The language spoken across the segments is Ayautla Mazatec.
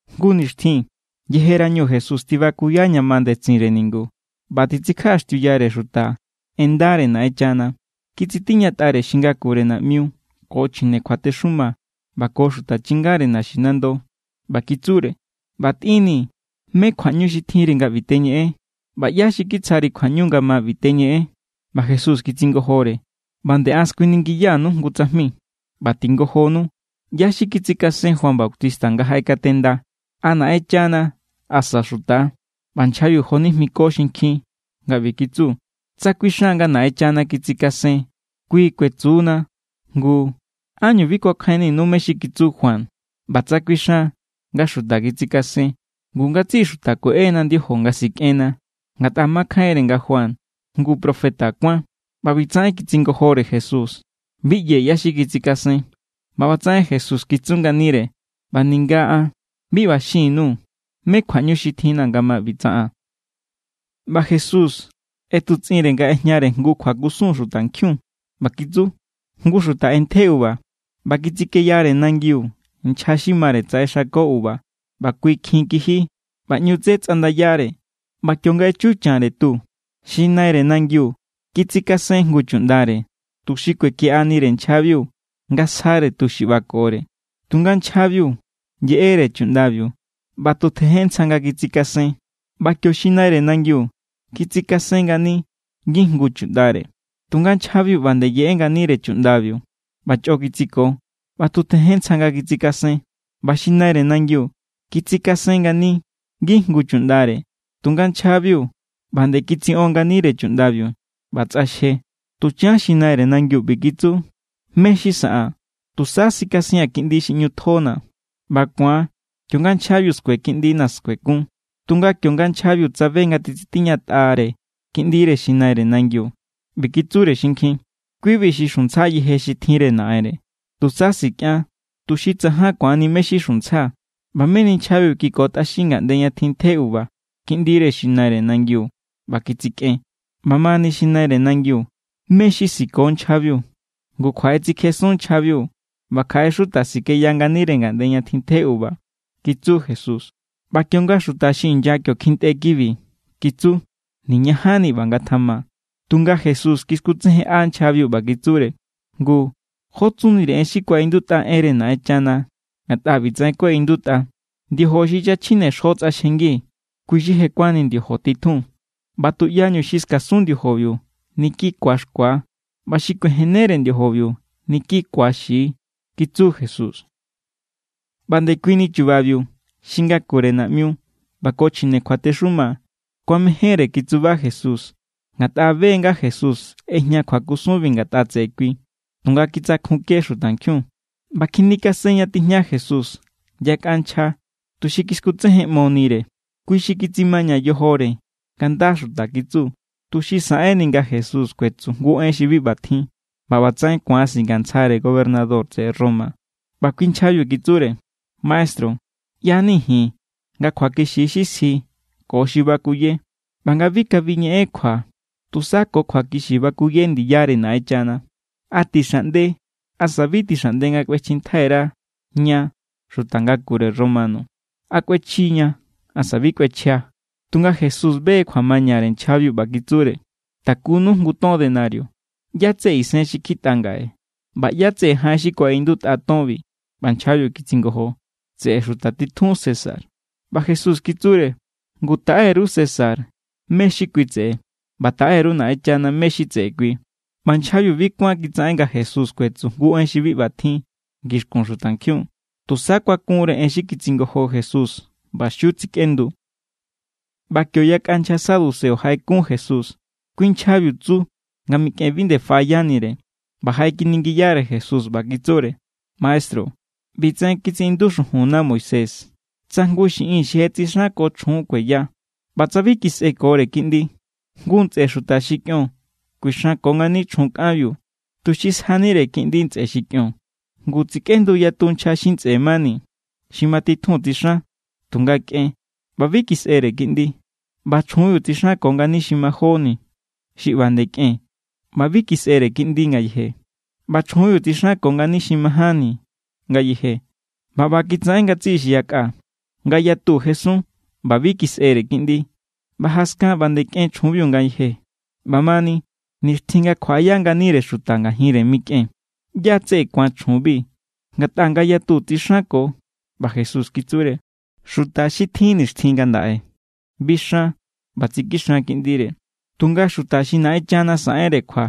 Jngu nixtjin yejerañu Jesús tibakuya ña ma ndetsinre ningu ꞌba titsikjaꞌaxtiuyare xuta en ndare Naꞌenchana, kitsitiñatꞌare xi ngakure naꞌmiu ko chjine kjuatexuma ꞌba ko xuta chingare naxinando, ꞌba kitsure: —ꞌBa tꞌinnii̱. ¿Mé= kjuaꞌñu xi tjinri nga ꞌbi teñeꞌen? ꞌBa ¿ꞌyá xi kitsjari kjuaꞌñu nga ma ꞌbi teñeꞌen? ꞌBa Jesús kitsingojore: —ꞌBa nde an skuiningiya_nuu̱ jngu tsajmi. ꞌBa tingojonu. ¿ꞌYá= xi kitsikasen Juan Bautista nga jaꞌekatenda, a Naꞌenchana, asa xuta=? ꞌBa nchjabiu jonijmiko xinkjin nga ꞌbi kitsu: —Tsa kuixan nga Naꞌenchana kitsikasen, kui kuetsu=na: “Ngu, ¿ánñu bi kuakjainninu mé= xi kitsu Juan?” ꞌBa tsa kuixan nga xuta kitsikasen, ngu ngatsiꞌi xuta kueꞌena ndiojo nga sikꞌenna, ngatꞌa makjainre nga Juan jngu profeta kuán. ꞌBa ꞌbitsaꞌen kitsingojore Jesús: —Bi ꞌyee̱ ꞌyá= xi kitsikasen. ꞌBa ꞌbatsaꞌen Jesús kitsu nganire: —ꞌBa ninga an bi ꞌba xin_nuu̱ mé kjuaꞌñu xi tjinna̱ nga ꞌbi tsaꞌaa̱n. ꞌBa Jesús ꞌetutsꞌinre nga ꞌejñare jngu kjuakusun xutankjiun, ꞌba kitsu: —Jngu xuta ꞌentje uva. ꞌBa kitsikeyare nangiu nchja xi mare tsaꞌexako uva ꞌba kui kjin kiji, ꞌba ꞌñu tsé tsꞌandayare. ꞌBa kionga echu chanre tu, xi naire nangiu kitsikasen jngu chuꞌndare, tuxi kuekiꞌanire nchjabiu nga sjare tu xi ꞌbakore. Tunga nchjabiu yeꞌere chuꞌndabiu ꞌba tu tjejen ntsja nga kitsikasen. ꞌBa kio xi naire nangiu kitsikasen ngani ngijngu chuꞌndare; tunga nchjabiu ꞌba nde yeꞌe nganire chuꞌndabiu, ꞌba chꞌo kitsiko ꞌba tu tjejen ntsja nga kitsikasen. ꞌBa xi naire nangiu kitsikasen ngani ngijngu chuꞌndare, tunga nchjabiu ꞌba nde kitsiꞌon nganire chuꞌndabiu ꞌba tsꞌaxje. ’Tuchan xi naire nangiu ꞌbi kitsu: “¿Mé= xi saꞌaa̱n? Tusa sikasia̱n kiꞌndi xi ꞌñu tjona̱. ꞌBa ku̱an kionga nchjabiu skue kiꞌndina̱, skuekun.” Tunga kionga nchjabiu tsabe nga titsitiñatꞌare kiꞌndire xi naire nangiu, ꞌbi kitsure xinkjin: “Kui=bi xi xuntsja yeje xi tjinre naꞌenre. Tusa sikꞌian, tuxi tsajan ku̱anni mé= xi xuntsja.” ꞌBa meni nchjabiu kikotꞌaxin ngaꞌnde ña tjintje uva kiꞌndire xi naire nangiu ꞌba kitsikꞌen. ’ꞌBa mani, xi naire nangiu, ¿Mé= xi siko nchjabiu? Ngu kjuaꞌetsikjesun nchjabiu ꞌba kjaꞌe xuta sikeya nganire ngaꞌnde ña tjintje uva —kitsu Jesús. ꞌBa kionga xuta xi inya kio kjintꞌe kibi, kitsu: —¡Niñajanni ꞌba ngatjama! Tunga Jesús kiskutsejenꞌa nchjabiu ꞌba kitsure: —Ngu, ¿jó tsunire en xi kuaꞌindutꞌa enre Naꞌenchana? Ngatꞌa ꞌbitsaꞌen kuaꞌindutꞌa: “Ndiojo xi nchja chjine xjo tsꞌaxjengi, kui= xi je kuánni ndiojo titjun.” ꞌBa tuꞌyañu xi skasun ndiojobiu, niki ku̱axkua. ꞌBa xi kuijennere ndiojobiu, niki ku̱axi —kitsu Jesús. ꞌBa ndekuini chubabiu xi ngakure naꞌmiu ꞌba ko chjine kjuatexuma kuamejénre kitsuba Jesús, ngatꞌa be= nga Jesús ꞌejña kjuakusunbi ngatꞌa tseꞌe kui, tunga kitsakjunke xutankjiun. ꞌBa kjinikasen ña tijña Jesús yakꞌa nchja, tuxi kiskutsejenꞌmonire. Kui xi kitsimaña yojore nga nda xuta kitsu, tuxi saꞌenni nga Jesús kuetsu jngu en xi bi ꞌba tjin, ꞌba ꞌbatsaꞌen ku̱an singantsjare gobernador tseꞌe Roma. ꞌBa kui nchjabiu kitsure: —Maestru, ꞌya=ni ji̱n nga kjuakixi= xi sji ko xi bakuye ꞌba nga bi kabi ñeꞌen kjua xuta. Tusa ko kjuakixi bakuye ndiyare Naꞌenchana. ¿A tixaꞌnde asa bi tixaꞌnde nga kꞌuechjintjai_ra ña xuta ngakure Romano? ¿A kꞌuechji=ña, asa bi kꞌuechja? Tunga Jesús be= kjuamañare nchjabiu, ꞌba kitsure: —Takunu jngu ton denario. ¿ꞌYá= tseꞌe isen xi kjitꞌa ngaꞌe, ꞌba ꞌyá= tseꞌe jaꞌen xi kuaꞌindutꞌa tonbi? ꞌBa nchjabiu kitsingojo: —Tseꞌe xuta titjun César. ꞌBa Jesús kitsure: —Ngu, taꞌe_ru César mé= xi kui tseꞌe, ꞌba taꞌe_ru Naꞌenchana mé= xi tseꞌe kui. ꞌBa nchjabiu bi kuán kitsaꞌen nga Jesús kuetsu jngu en xi bi ꞌba tjin ngixkun xutankjiun. Tusa kuakunre en xi kitsingojo Jesús ꞌba xiu tsikꞌendu. ꞌBa kio yakꞌa nchja saduceo jaꞌekun Jesús. Kui nchjabiu tsu nga mikꞌen bi nde faꞌayanire; ꞌba jaꞌekiningiyare Jesús, ꞌba kitsure: —Maestru, ꞌbitsaꞌen kitsiꞌindu xujunna Moisés: “Tsa jngu xiꞌin xi je tsixanko chjun kueya, ꞌba tsa bi kisꞌekore kiꞌndi, jngu ntsꞌe xuta xi kꞌion kuixanko ngani chjun kꞌanbiu tuxi sjanire kiꞌndi ntsꞌe xi kꞌion.” Ngu, tsikꞌendu yatu nchja xi ntsꞌe mani. Xi matitjun tsixan; tunga kꞌen, ꞌba bi kisꞌere kiꞌndi. ꞌBa chjunbiu tsixanko ngani xi majóni, xi ꞌba nde kꞌen, ꞌba bi kisꞌere kiꞌndi ngayeje. ꞌBa chjunbiu tsixanko ngani xi majánni ngayeje, ꞌba ꞌba kitsaꞌen ngatsiꞌi xi yakꞌa. Ngayatu jesun, ꞌba bi kisꞌere kiꞌndi. ꞌBa jaskan ꞌba nde kꞌen chjunbiu ngayeje. ꞌBamani, nixtjin nga kjuaꞌaya nganire xuta ngajinre mikꞌen, ¿ꞌyá= tseꞌe ku̱an chjunbi? Ngatꞌa ngayatu tsixanko. ꞌBa Jesús kitsure: —Xuta xi tjin nixtjin ngandaꞌe bixan ꞌba tsikixan kiꞌndire. Tunga xuta xi Naꞌenchana saꞌenre kjua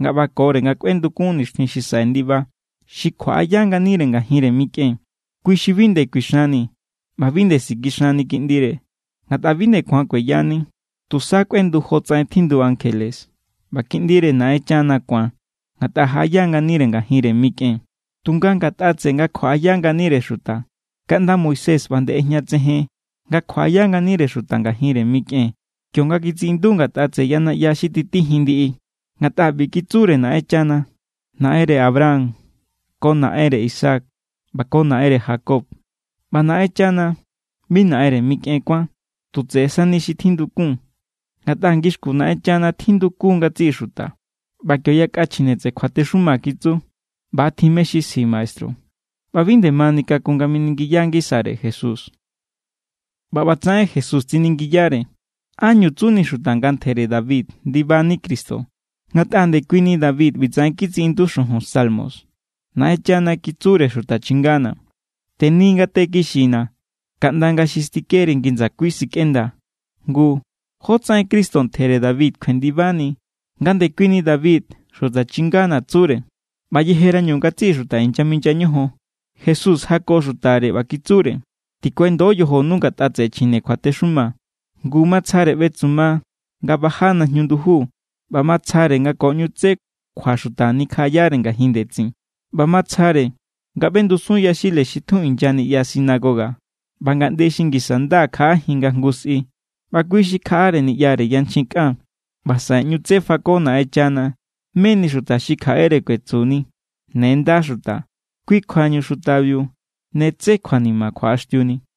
nga ꞌbakore nga kꞌuendukun nixtjin xi saꞌe ndiba, xi kjuaꞌaya nganire ngajinre mikꞌen, kui= xi bi nde kuixanni ꞌba bi nde sikixanni kiꞌndire, ngatꞌa bi nde ku̱an kueyani. Tusa kꞌuendu jotsaꞌen tjindu ankjele, ꞌba kiꞌndire Naꞌenchana ku̱an, ngatꞌa jaꞌaya nganire ngajinre mikꞌen. Tunga ngatꞌa tseꞌe nga kjuaꞌaya nganire xuta, kaꞌnda Moisés ꞌba nde ꞌejñatsejen nga kjuaꞌaya nganire xuta ngajinre mikꞌen, kionga kitsiꞌindu ngatꞌa tseꞌe ya naꞌya xi titijin ndiꞌi. Ngatꞌa ꞌbitsaꞌen kitsure Naꞌenchana: “Naꞌenre Abraham ko Naꞌenre Isaac ꞌba ko Naꞌenre Jacob.” ꞌBa Naꞌenchana bi naꞌenre mikꞌen kuán, tu tseꞌe sani xi tjindukun. Ngatꞌa ngixkun Naꞌenchana tjindukun= ngatsiꞌi xuta. ꞌBa kio yakꞌa chjine kjuatexuma kitsu: —ꞌBa= tjin mé= xi sji, maestru. ꞌBa bi nde mani kakun nga miningiya ngisare Jesús. ꞌBa ꞌbatsaꞌen Jesús tsiningiyare: —¿Ánñu tsuni xuta nga ntjere David ndibani Cristo? Ngatꞌa ndekuini David ꞌbitsaꞌen kitsiꞌindutꞌa xujun Salmos: Naꞌenchana kitsure Xuta chingana̱: “Teni ngate kixina̱ kaꞌnda nga̱ xi stikeri ngi ndsakui sikꞌendaa̱.” Ngu, ¿jótsaꞌen Cristo ntjere David kjuendibani, nga ndekuini David “Xuta chingana̱” tsure? ꞌBa yejerañu ngatsiꞌi xuta inyaminya ñojon, Jesús jako xutare, ꞌba kitsure: —Tikuendo yojonu ngatꞌa tseꞌe chjine kjuatexuma. Ngu, matsjare ꞌbetsuma nga baja najñu nduju ꞌba matsjare nga ko ꞌñu tsé kjuaxuta nikjaꞌayare ngajin ndetsin. ꞌBa matsjare nga ꞌbendusun yaxile xi tjun inya niꞌya sinagoga ꞌba ngaꞌnde xi ngisa nda kjaꞌajin nga jngu sꞌi. ꞌBa kui xi kjaꞌare niꞌyare yanchjin kꞌan, ꞌba saꞌe ꞌñu tsé fako Naꞌenchana meni xuta xi kjaꞌere kuetsuni: “Ne nda xuta.” Kui kjuañu xutabiu ne tsé kjuanima kjuaꞌaxtiuni.